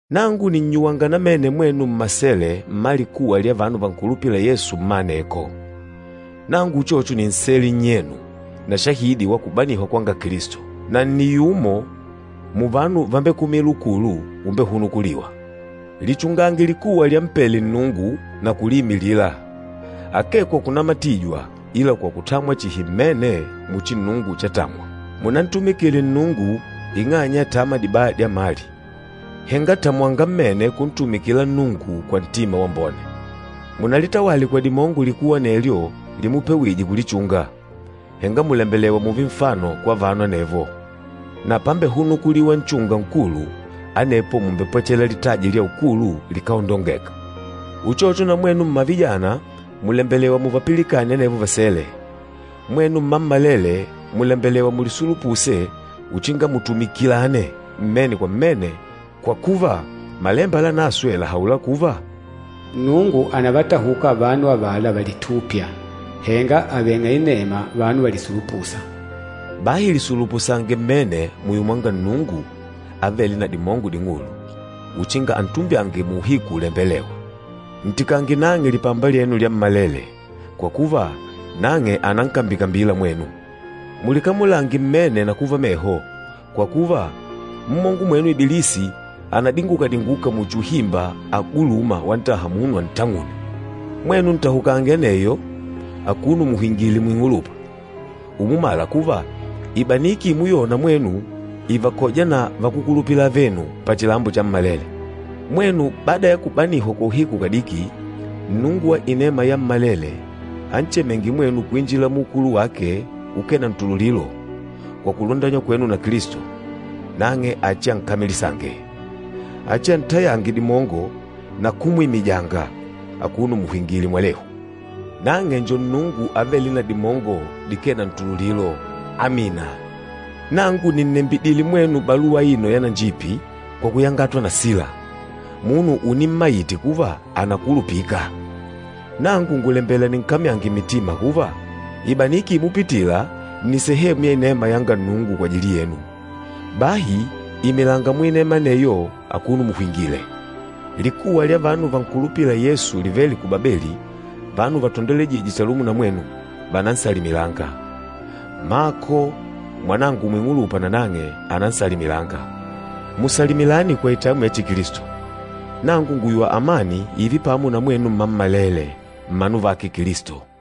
Nangu nìnnyuwanga namene mwenu mmasele mma likuwa lya vanu vankulupîla Yesu mma aneko. Nangu uchocho ni nsele nnyenu na shahidi wa kubanihwa kwanga Kilisto, na nni yumo muvanu vambekumîla ukulu umbehunukulîwa. Lichungange likuwa lyampele Nnungu na kuliimilila, akee kwa kunamatijwa ila kwa kutamwa chihi mmene muchi Nnungu chatamwa. Munantumikile Nnungu ing'anya ya tama dibaya dya mali, henga tamwanga namene kuntumikila Nnungu kwa ntima wambone. Munalitawale kwa dimongo likuwa anelyo limupewije kulichunga, henga mùlembelewa mùùve nfano kwa vanu anevo. Na pambehunukuliwa Nchunga Nkulu, anepo mumbepwechela litaji lya ukulu likáondongeka. Uchocho na mwenu mmavijana mùlembelewa muvapilikane anevo vasele. Mwenu mmammalele mùlembelewa mulisulupuse uchinga mutumikilane mmene kwa mmene, kwa kuva Malemba Lanaswe làhaula kuva, “Nnungu ànavatahuka vanu avala valitûpya, henga aveng'a inema vanu valisulupûsa.” Bahi lisulupusange mmene muyo mwanga Nnungu avêle na dimongo ding'ulu, uchinga antumbyange muuhiku ulembelêwa. Ntikange nang'e lipamba lyenu lyammalele, kwa kuva nang'e ànankambikambila mwenu. Mulikamulange mmene na kuva meho, kwa kuva, mmongo mwenu Ibilisi ànadinguka-dinguka muchi uhimba agulûma wantaha munu antang'une. Mwenu ntahukange aneyo, akuno muhwingìlè muing'ulupa, umumala kuva ibaniki imuyona mwenu ìvakoja na vakúkulupila avenu pachilambo chammalele. Mwenu bada ya kubanihwa kwa uhiku kadiki, Nnungu wa inema yammalele anchemênge mwenu kuinjila muukulu wake ukee na ntululilo kwa kulundanywa kwenu na Kilisto, nang'e achiankamilisange. Achiantayange dimongo na kumwimijanga, akuno muhwingìlè mwalehu. Nang'e njo Nnungu avêle na dimongo dikee na ntululilo. Amina. Nangu nìnnembidile mwenu baluwa aino yananjipi kwa kuyangatwa na Sila, munu unimmaite kuva ànakulupika. Nangu ngùlembela ninkamyange mitima kuva, ibaniki imupitila nni sehemu ya inema yanga Nnungu kwajili yenu. Bahi imilanga muinema aneyo akuno muhwingìlè. Likuwa lya vanu vankulupîla Yesu livêle ku Babeli, vanu vatandolwejîje chalumo na mwenu, vànansalimilanga. Mako, mwanangu muing'ulupa nanang'e ànansalimilanga. Musalimilane kwa itamwi ya Chikilisto. Nangu ngùyuwa amani ììve pamo na mwenu mmammalele, mmanu vake Kilisto.